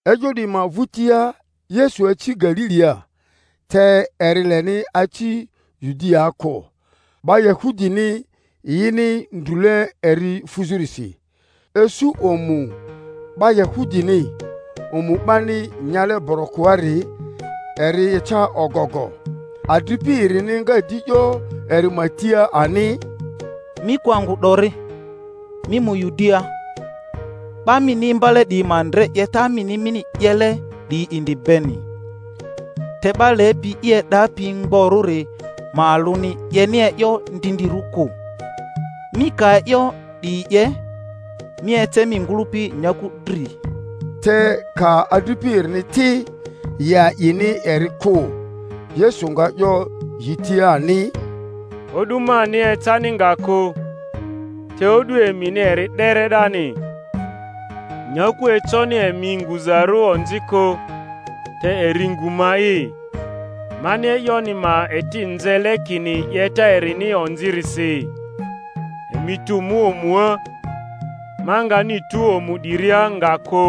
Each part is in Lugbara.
E'yo 'diyi ma vᴜtia Yesu aci Galilia; te eri leni aci Yudiaa kᴜ, 'ba Yahudini yini ndrule eri fuzᴜrisi. Isu omu 'ba Yahudini, omu 'bani nyale borokoari, eri eca ogogo. Adripi erini nga di 'yo eri ma tia ani, Mi kᴜ angᴜ 'dori, mi mu Yudiaa, 'ba mini imbale 'diyi ma ndre 'yeta mini mini 'yele 'diyi indi beni. Te 'ba lepi i e'dapi mgborᴜri ma alᴜni 'yeni e'yo ndindirᴜ kᴜ. Mi ka e'yo 'diyi 'ye, mi ece mi ngᴜlᴜpi nyaku dri. Te ka adripi erini ti, yi a'ini eri kᴜ. Yesu nga 'yo yi tia ani, O'du mani ecani nga kᴜ, te o'du emini eri 'dere 'dani. Nyaku econi emi nguzarᴜ onzi kᴜ, te eri ngᴜ ma'i, mani e'yoni ma eti nzele kini 'yeta erini onzirisi. Emi tu mu omua; ma ngani tu omu 'diria nga kᴜ,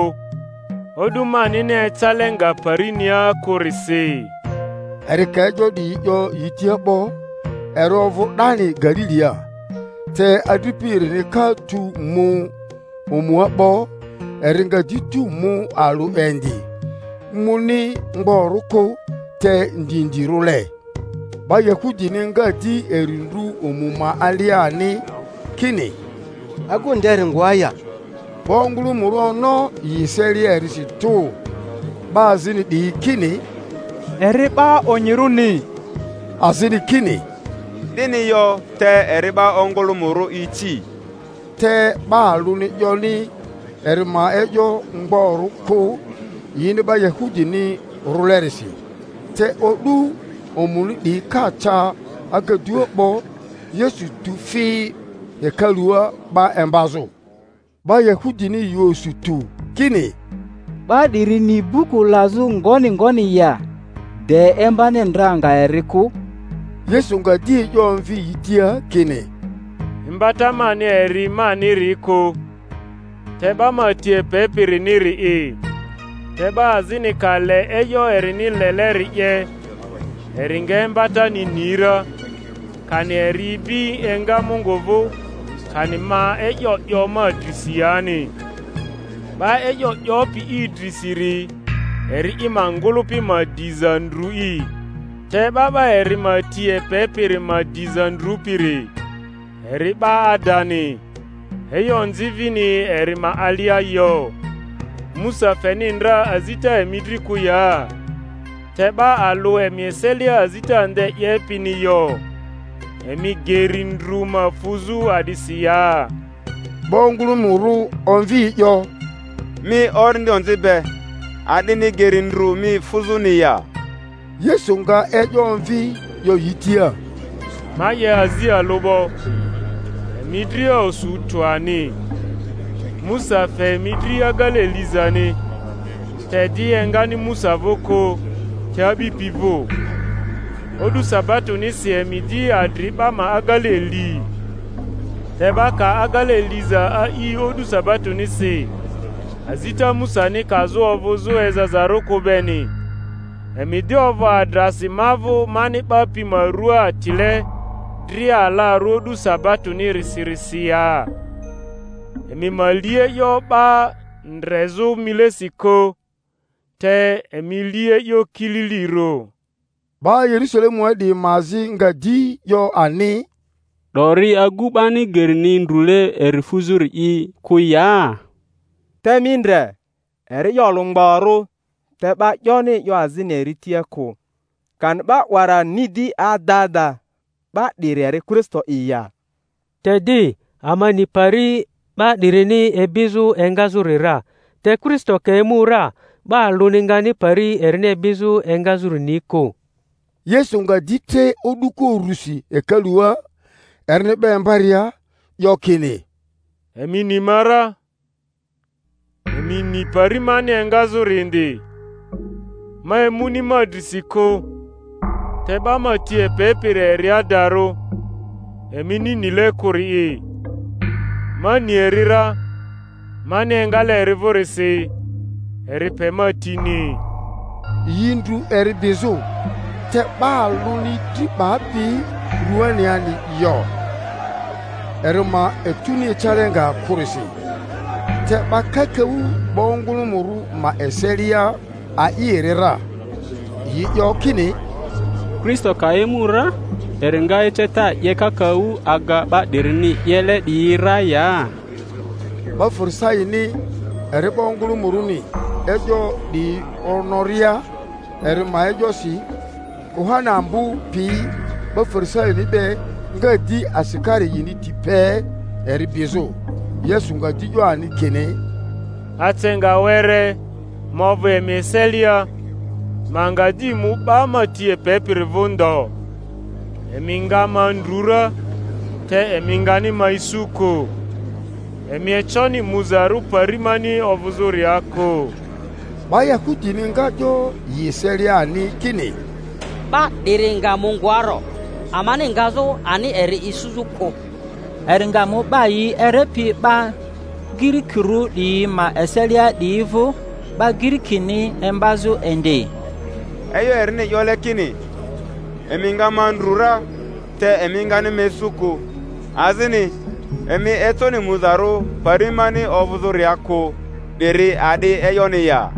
o'du manini ecale nga parinia kᴜrisi. Eri ka e'yo 'diyi 'yo yi tia 'bo, eri ovᴜ 'dani Galilia. Te adripi erini ka tu mu omua 'bo, eri nga di tu mu alᴜ indi, muni mgborᴜ kᴜ, te ndindirᴜle. 'Ba Yahudini nga di eri ndru omu ma alia ani, kini, Agu nderi ngoa ya? 'Ba ongᴜlᴜmᴜrᴜ ono yi eselia erisi tᴜ. 'Ba azini 'diyi kini, Eri 'ba onyirᴜni; azini kini, 'Dini yo, te eri 'ba ongᴜlᴜmᴜrᴜ ici. Te 'ba alᴜni 'yoni eri ma e'yo mgborᴜ kᴜ, yini 'ba Yahudini rᴜlerisi. Te o'du omuni 'diyi ka ca agadua 'bo, Yesu tu fi hekalua 'ba imbazᴜ. 'Ba Yahudini yi osu tᴜ kini, 'Ba 'diri ni buku lazᴜ ngoni ngoni ya, de imbani ndra nga eri kᴜ? Yesu nga di e'yo omvi yi tia kini, Imbata mani eri maniri kᴜ, te 'ba ma ti epepiriniri'i; te 'ba azini ka le e'yo erini leleri 'ye, eri nga imbatani ni ra, kani eri ibi enga Mungu vᴜ, kani ma e'yo 'yo ma drisi yani. 'Ba e'yo 'yopi i drisiri eri i ma ngᴜlᴜpi ma diza ndru'i; te 'ba 'ba eri ma ti epepiri ma diza ndrupiri, eri 'ba adani, e'yo onzi vini eri ma alia yo. Musa feni ndra azita emi dri kᴜ ya? Te 'ba alᴜ emi eselia azita nde 'yepini yo. Emi geri ndru ma fuzᴜ a'disi ya? 'Ba ongᴜlᴜmᴜrᴜ omvi e'yo, Mi orindi onzi be! A'dini geri ndru mi fuzᴜni ya? Yesu nga e'yo omvi 'yo yi tia, Ma 'ye azi alᴜ 'bo, emi dria osu tᴜ ani. Musa fe emi dri agele lizani (te di, engani Musa vᴜ kᴜ, te a'bipi vᴜ); o'du sabatonisi emi di adri 'ba ma agele li. Te 'ba ka agele liza a'i o'du sabatonisi, azita Musani kazᴜ ovᴜzᴜ ezazarᴜ kᴜ beni, emi di ovᴜ adrasi ma vᴜ mani 'ba pi ma rua atile dria alarᴜ o'du sabatonisirisi ya? Emi ma li e'yo 'ba ndrezᴜ milesi kᴜ, te emi li e'yo kililirᴜ. 'Ba Yerusalemua 'diyi ma azi nga di 'yo ani, 'Dori agu 'bani gerini ndrule eri fuzᴜri'i kᴜ ya? Te mi ndre, eri e'yo olᴜ mgborᴜ te 'ba 'yoni e'yo azini eri tia kᴜ! Kani 'ba 'wara ni di ada ada 'ba 'diri eri Kristo'i ya? Te di ama ni pari 'ba 'dirini ibizᴜ engazᴜri ra; te Kristo ka emu ra, 'ba alᴜni ngani pari erini ibizᴜ engazᴜri ni kᴜ. Yesu nga di tre o'duko urusi hekalua, erini 'ba imbaria, 'yo kini, Emi ni ma ra, emi ni pari mani engazᴜri indi. Ma emuni ma drisi kᴜ, te 'ba ma ti epepiri eri adarᴜ, emini nile kᴜri'i. Ma ni eri ra, mani engale eri vᴜrisi, eri pe ma tini. Yi ndru eri bizᴜ; te 'ba alᴜni dri 'bapi ruaniani yo, eri ma etuni ecale nga kᴜrisi. Te 'ba kakaᴜ 'ba ongᴜlᴜmᴜrᴜ ma eselia a'i eri ra; yi 'yo kini, Kristo ka emu ra, eri nga eceta 'ye kakaᴜ aga 'ba 'dirini 'yele 'diyi ra ya? 'Ba Farisaini eri 'ba ongᴜlᴜmᴜrᴜni e'yo 'diyi onoria eri ma e'yosi, kuhani ambo piyi 'ba Fari-saini be nga di asikari yini ti pe eri bizᴜ. Yesu nga di 'yo ani kini, Ace nga were ma ovᴜ emi eselia, ma nga di mu 'ba ma ti epepiri vᴜ ndo; emi nga ma ndru ra, te emi ngani ma isu kᴜ; emi econi muzarᴜ pari mani ovᴜzᴜria kᴜ. 'Ba Yahudini nga 'yo yi eselia ani kini, 'Ba 'diri nga mu ngoarᴜ, amani ngazᴜ ani eri isuzᴜ kᴜ? Eri nga mu 'Ba yi Erepi 'ba Girikirᴜ 'diyi ma eselia 'diyi vᴜ, 'ba Girikini imbazᴜ indi? E'yo erini 'yole kini, Emi nga ma ndru ra, te emi ngani ma isu kᴜ; azini, Emi econi muzarᴜ pari mani ovᴜzᴜria kᴜ, 'diri a'di e'yoni ya?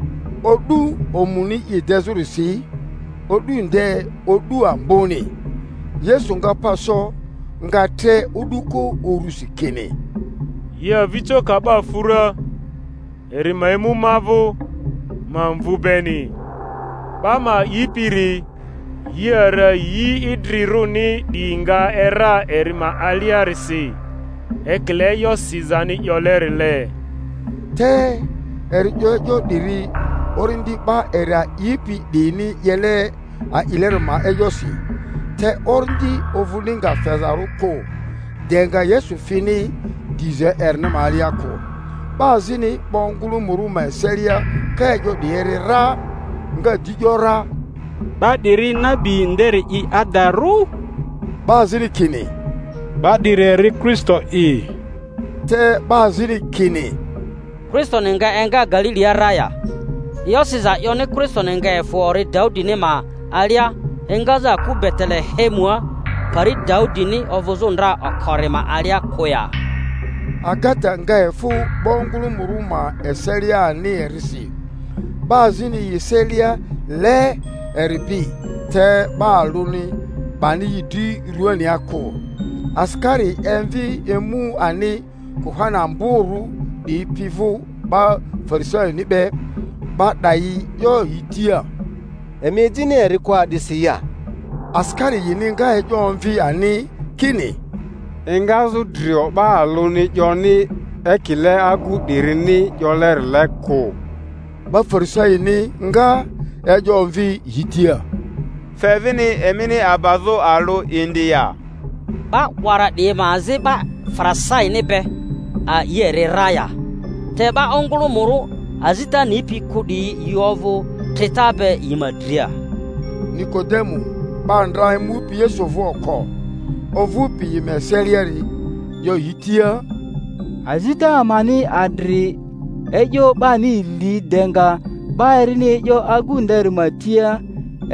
O'du omuni i dezᴜrisi, o'du nde o'du amboni, Yesu nga pa so, nga tre o'duko urusi kini, Yi avijo ka 'ba fu ra, eri ma emu ma vᴜ, ma mvu beni. 'Ba ma a'ipiri, yi ara yi idrirᴜni 'diyi nga era eri ma aliarisi, ekile e'yo sizani 'yolerile. Te eri 'yo e'yo 'diri Orindi 'ba eri a'ipi 'diyini 'yele a'ileri ma e'yosi; te Orindi ovᴜni nga fezarᴜ kᴜ, de nga Yesu fini diza erini ma alia kᴜ. 'Ba azini 'ba ongᴜlᴜmᴜrᴜ ma eselia ka e'yo 'diyi eri ra, nga di ‘yora, 'Ba 'diri nabi nderi'i adarᴜ. 'Ba azini kini, 'Ba 'diri eri Kristo'i. Te 'ba azini kini, Kristoni nga enga Galilia ra ya? E'yo siza 'yoni Kristoni nga efᴜ ori Daudini ma alia, engazᴜ aku Betele-hemua pari Daudini ovᴜzᴜ ndra okori ma alia kᴜ ya? Agata nga efᴜ 'ba ongᴜlᴜmᴜrᴜ ma eselia ani erisi. 'Ba azini yi eselia le eri bi, te 'ba alᴜni 'bani yi dri ruania kᴜ. Asikari emvi emu ani kuhani amborᴜ 'diyi pi vᴜ 'ba Farisaini be; 'ba 'dayi 'yo yi tia, Emi ejini eri kᴜ a'disi ya? Asikari yini nga e'yo omvi ani kini, Engazᴜ drio 'ba alᴜni 'yoni ekile agu 'dirini 'yolerile kᴜ! 'Ba Farisaini nga.e'yo omvi yi tia, Fe vini emini abazᴜ alᴜ indi ya? 'Ba 'wara 'diyi ma azi 'ba Farisaini be ali eri ra ya? Te 'ba ongᴜlᴜmᴜrᴜ azita nipi kᴜ 'diyi yi ovᴜ trita be yi ma dria. Nikodemu 'ba ndra emupi Yesu vᴜ oko, ovᴜpi yi ma eseliari, 'yo yi tia, Azita amani adri e'yo 'bani li de nga 'ba erini e'yo agu nderi ma tia,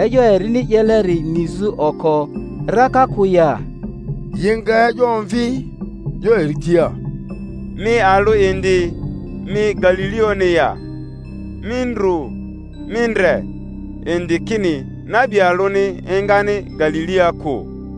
e'yo erini 'yeleri nizᴜ oko raka kᴜ ya? Yi nga e'yo omvi, 'yo eri tia, Mi alᴜ indi mi Galilioᴜni ya? Mi ndru, mi ndre indi kini nabi alᴜni engani Galilia kᴜ.